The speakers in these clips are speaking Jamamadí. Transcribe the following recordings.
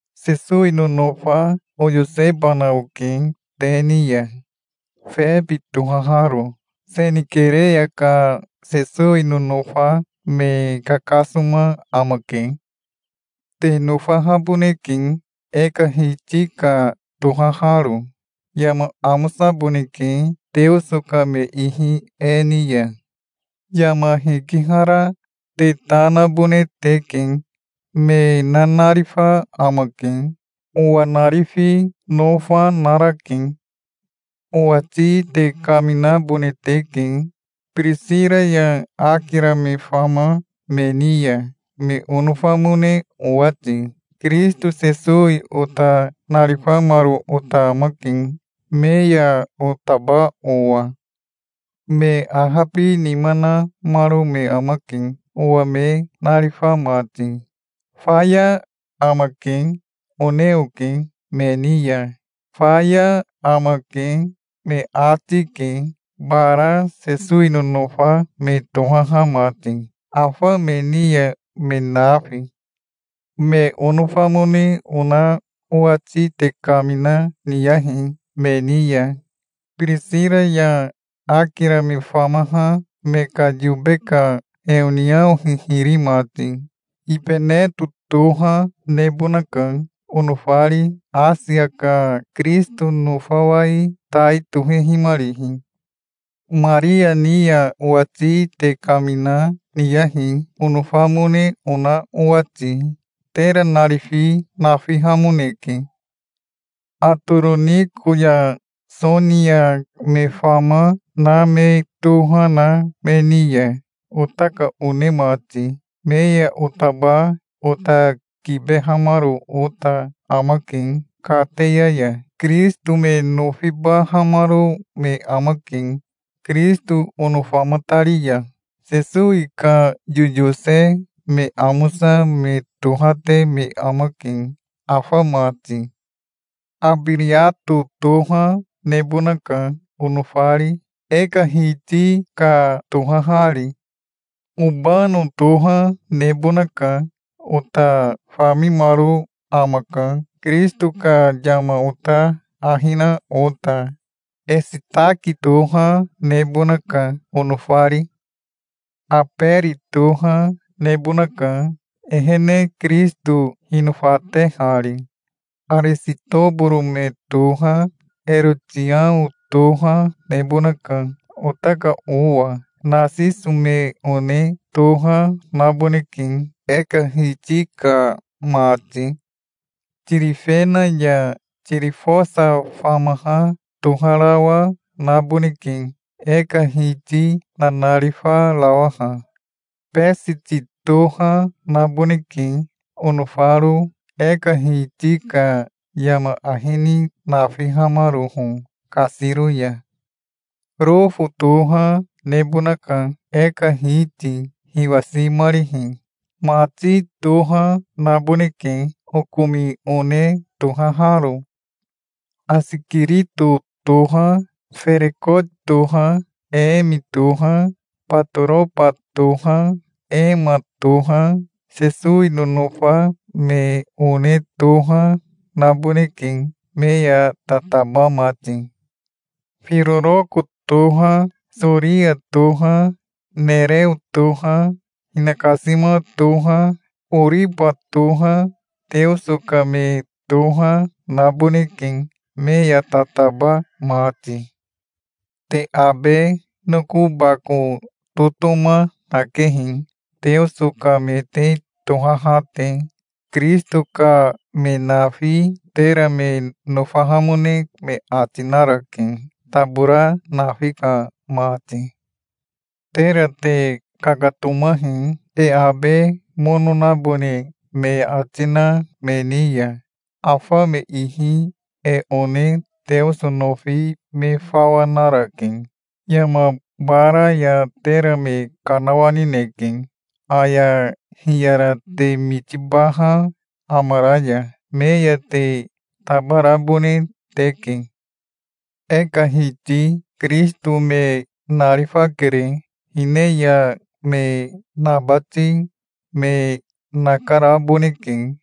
Sesowi nonofa oyosebana oke te ni ya, Febi tohaharo. Senikereya ka Sesowi nonofa me kakasoma amake. Te nofahaboneke, e ka Hiti ka tohaharo. Yama amosaboneke, Teoso ka me ihi e ni ya. Yama hikihara te ta nabone teke. Me nanarifa amake. Owa narifi nofa narake. Owati te kaminabone teke, Birisira ya Akira me fama me ni ya, me onofamone owati. Kirisito Sesowi ota narifamaro ota amake, me ya otaba owa. Me ahabinima namaro me amake, owa me narifa mati. "Faya amake", one oke me ni ya. "Faya amake", me ati, ke, bara Sesowi nonofa me tohaha mati, afa me ni ya, me nafi. Me onofamone ona owati te kamina niyahi me ni ya, Birisira ya Akira me famaha me ka yobe ka heoniao hihiri mati. Ibeneto toha nebonaka, onofari, Asia ka Kirisito nofawai tai tohehimarihi. Maria ni ya owati te kamina, niyahi, onofamone ona owati. Tera narifi nafihamoneke. Atoroniko ya Sonia me fama, na me toha na me ni ya, ota ka one mati. Me ya otaba ota kibehamaro ota amake kateya ya. Kirisito me nofibahamaro me amake, Kirisito onofamatari ya. Sesowi ka yoyose me amosa me tohate me amake afa mati. Abiriato toha nebonaka, onofari, e ka Hiti ka tohahari. Obano toha nebonaka. Ota famimaro amaka, Kirisito ka yama ota ahi na ota. Esitaki toha nebonaka, onofari. Aberi toha nebonaka, ehene Kirisito hinofatehari. Arisitoboro me toha, Erotiao toha nebonaka, ota ka owa. Nasiso me one toha naboneke, e ka Hiti ka mati. Tirifena ya Tirifosa famaha toharawa naboneke, e ka Hiti nanarifarawaha. Besiti toha naboneke onofaro e ka Hiti ka yama ahi ni nafihamaroho kasiro ya. Rofo toha nebonaka, e ka Hiti hiwasimarihi. Mati toha naboneke, okomi one tohaharo. Asikirito toha, Ferekoti toha, Emi toha, Batoroba toha, Ema toha, Sesowi nonofa me one toha naboneke, me ya tataba mati. Firoroko toha, Soria toha, Nereo toha, hinakasima toha, Oriba toha, Teoso ka me toha naboneke, me ya tataba mati. Te abe noko bako totoma nakehi, Teoso ka me te tohaha te. Kirisito ka me nafi tera me nofahamone me ati narake, tabora nafi ka mati. Tera te kakatomahi, e abe mono nabone me ati na me ni ya. Afa me ihi e one Teoso nofi me fawa narake. Yama bara ya tera me kanawanineke, aya hiyara te mitibaha amara ya. Me ya te tabarabone teke. E ka Hiti Kirisito me narifakere. Hine ya me nabati me nakaraboneke.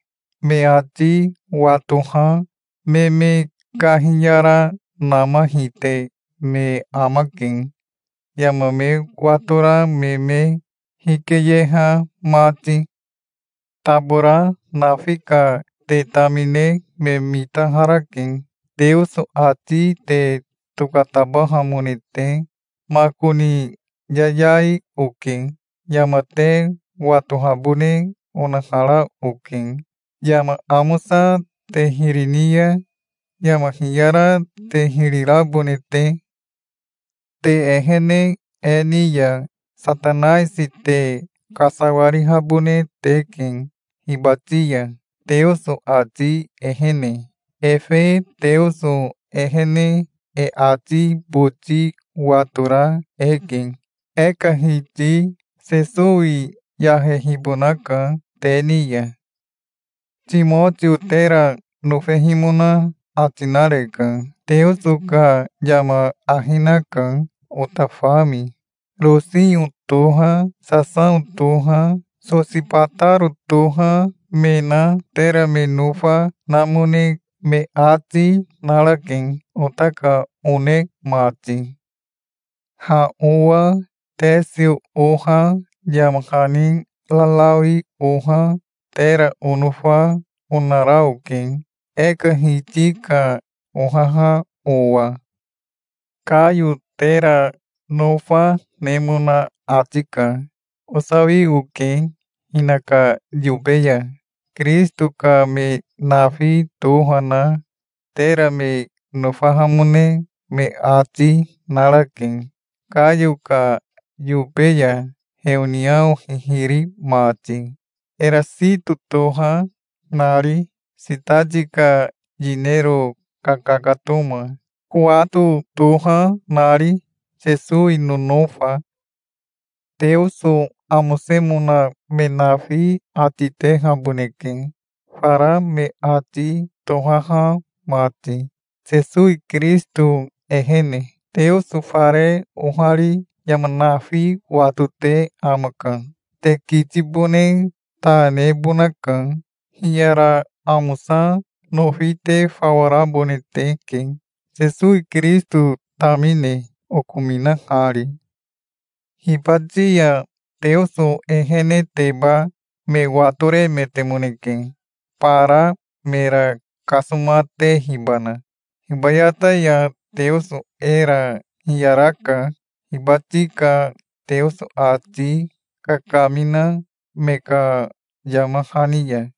Me ati watoha me me kahiyaranama hite me amake, yama me watora me me hikeyeha mati. Tabora nafi ka te tamine me mitaharake, Teoso ati te tokatabahamone te. Makoni yayai oke. Yama te watohabone onahara oke, yama amosa te hiri ni ya yama hiyara te hiri rabone te. Te ehene e ni ya Satanaisi te kasawarihabone teke hibati ya, Teoso ati ehene. Efe Teoso ehene e ati boti watora eke. E ka Hiti Sesowi yahehibonaka te ni ya. Timotio tera nofehimona ati nareka. Teoso ka yama ahi naka, ota fami. Rosio toha, Sasao toha, Sosibataro toha me na tera me nofa namone me ati, narake, ota ka one mati. Ha owa Tesio oha yama hani rarawi oha tera onofa onara oke, e ka Hiti ka ohaha owa. Kayo tera nofa nemona ati ka. Osawi oke hinaka yobe ya. Kirisito ka me nafi toha na tera me nofahamone me ati, narake, Kayo ka yobe ya heoniao hihiri mati, Erasito toha nari, sitati ka yinero kakakatoma, Kowato toha nari, Sesowi nonofa. Teoso amosemona me nafi ati tehaboneke, fara me ati tohaha mati, Sesowi Kirisito ehene. Teoso fare ohari yama nafi watote amaka. Te kitibone ta nebonaka. Hiyara amosa nofi te fawa rabone teke, Sesowi Kirisito tamine, okominahari. Hibati ya Teoso eheneteba me watoremetemoneke, bara mera kasomatehibana. Hibayata ya Teoso era hiyaraka, hibati ka Teoso ati kakamina me ka yama hani ya.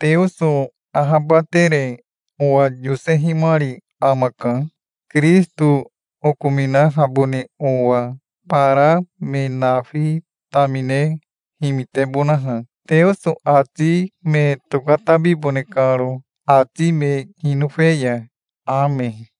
Teoso ahabatere owa yosehimari amaka, Kirisito okominahabone owa, bara me nafi tamine himitebonaha, Teoso ati me tokatabibone karo, ati me hinofe ya. Ame.